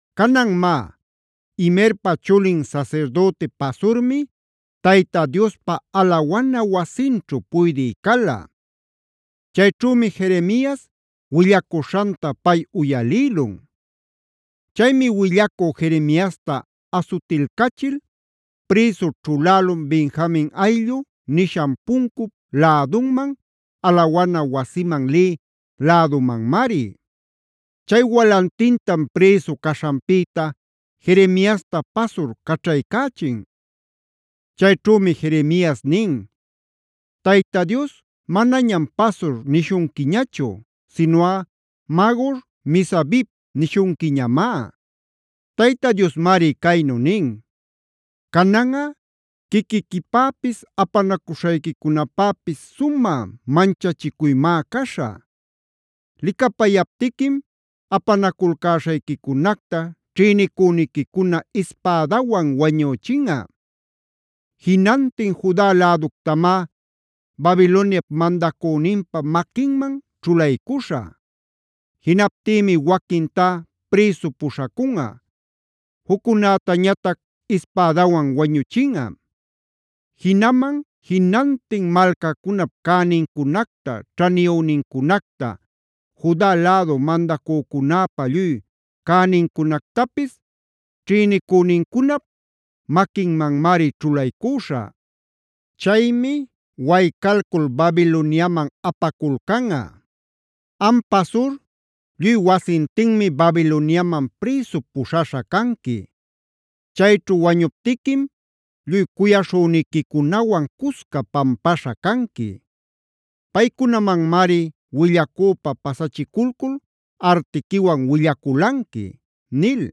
Canan má, Imerpa chulin sasirdüti Pasurmi Tayta Diospa alawana wasinćhu puydï cala. Chayćhümi Jeremias willacuśhanta pay uyalïlun. Chaymi willacü Jeremiasta asutilcachil prïsu ćhulälun Benjamin ayllu nishan puncup lädunman, alawana wasiman lï lädumanmari. Chay walantintam prïsu caśhanpïta Jeremiasta Pasur caćhaycächin. Chayćhumi Jeremias nin: “Tayta Dios manañam Pasura nishunquiñachu, sinuꞌa Magor-misabibb nishunquiñamá. Tayta Diosmari caynu nin: ‘Cananꞌa quiquiquipäpis apanacuśhayquicunapäpis sumä manchachicuymá caśhä. Licapayaptiquim apanaculcäśhayquicunacta ćhïnicüniquicuna ispädawan wañüchinꞌa. Jinantin Juda läductamá Babiloniap mandacüninpa maquinman ćhulaycüśhä. Jinaptïmi waquintá prïsu puśhacunꞌa, juccunätañatac ispädawan wañuchinꞌa. Jinaman jinantin malcacunap cänincunacta, ćhaniyünincunacta, Juda lädu mandacücunäpa lluy cänincunactapis ćhïnicünincunap maquinmanmari ćhulaycüśhä. Chaymi waycalcul Babiloniaman apaculcanꞌa. Am Pasur, lluy wasintinmi Babiloniaman prïsu puśhaśha canqui. Chayćhu wañuptiquim lluy cuyaśhüniquicunawan cusca pampaśha canqui. Paycunamanmari willacüpa pasachiculcul artiquiwan willaculanqui’” nil.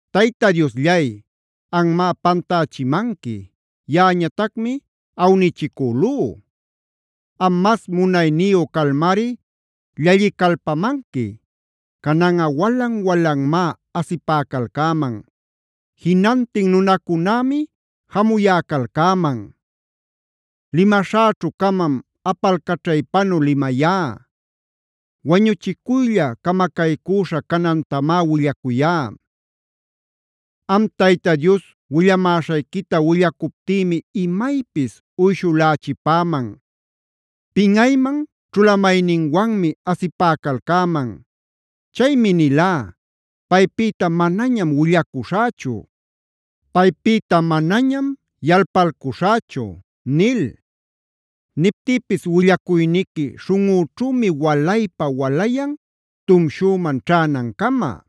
Tayta Diosllay, anmá pantächimanqui; yaꞌañatacmi awnichicülú. Am mas munayniyu calmari llallicalpamanqui; cananꞌa walan-walanmá asipäcalcäman; jinantin nunacunämi jamuyäcalcäman. Limaśhäćhu-camam apalcaćhaypanu limayá; wañuchicuylla, camacaycüśha canantamá willacuyá. Am Tayta Dios willamäśhayquita willacuptïmi imaypis uyshulachipäman; pinꞌayman ćhulamayninwanmi asipäcalcäman. Chaymi nilá: “Paypïta manañam willacuśhächu; paypïta manañam yalpalcuśhächu” nil. Niptïpis willacuyniqui śhunꞌućhümi walaypa-walayan, tumshüman ćhänancama.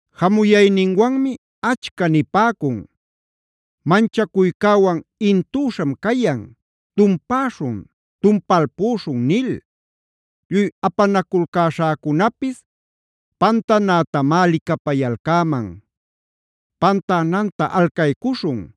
Jamuyayninwanmi achca nipäcun: “Manchacuycäwan intüśham cayan, ¡tumpäśhun, tumpalpüśhun!” nil. Lluy apanaculcäśhäcunapis pantanätamá licapayalcäman: “Pantänanta alcaycuśhun;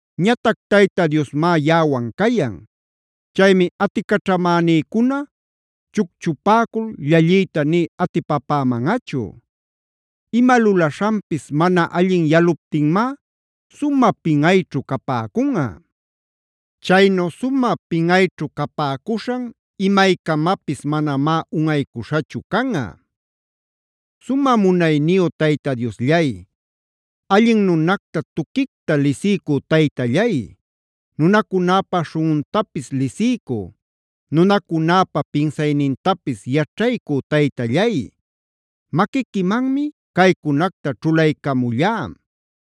Ñatac Tayta Diosmá yaꞌawan cayan. Chaymi aticaćhamänïcuna chucchupäcul llalliyta nï atipapämanꞌachu. Ima lulaśhanpis mana allin yaluptinmá sumä pinꞌayćhu capäcunꞌa. Chaynu sumä pinꞌayćhu capäcuśhan imaycamapis manamá unꞌaycuśhachu canꞌa. Sumä munayniyu Tayta Diosllay, allin nunacta tuquicta lisiycü Taytallay, nunacunäpa śhunꞌuntapis lisiycü, nunacunäpa pinsaynintapis yaćhaycü Taytallay, maquiquimanmi caycunacta ćhulaycamullá.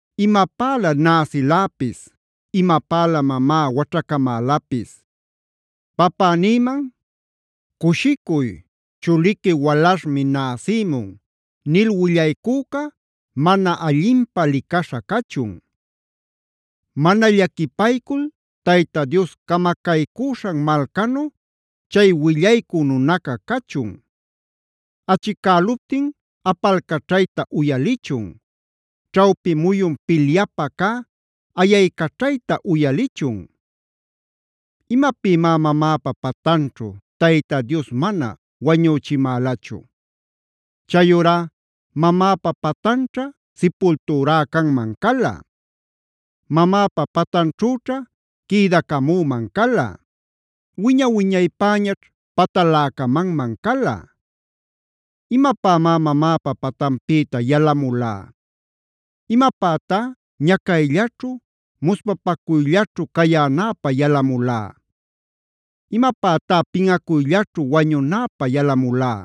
¡Imapälä näsiläpis!f ¡Imapälä mamá waćhacamälapis! Papänïman: “Cushicuy, chuliqui walaśhmi näsïmun” nil willaycüca mana allinpä licaśha cachun. Mana llaquipaycul Tayta Dios camacaycüśhan malcanu, chay willaycü nunaca cachun; achicäluptin apalcaćhayta uyalichun; ćhawpi muyun pilyapä cä ayaycaćhayta uyalichun. ¿Imapïmá mamäpa patanćhu Tayta Dios mana wañüchimälachu? Chayurá mamäpa patanćha sipultürá canman cala. Mamäpa patanćhüćha quïdacamüman cala; wiña-wiñaypäñaćh pataläcamanman cala. ¿Imapämá mamäpa patanpïta yalamulá? ¿Imapätá ñacayllaćhu, muspapacuyllaćhu cayänäpä yalamulá? ¿Imapätá pinꞌacuyllaćhu wañunäpä yalamulá?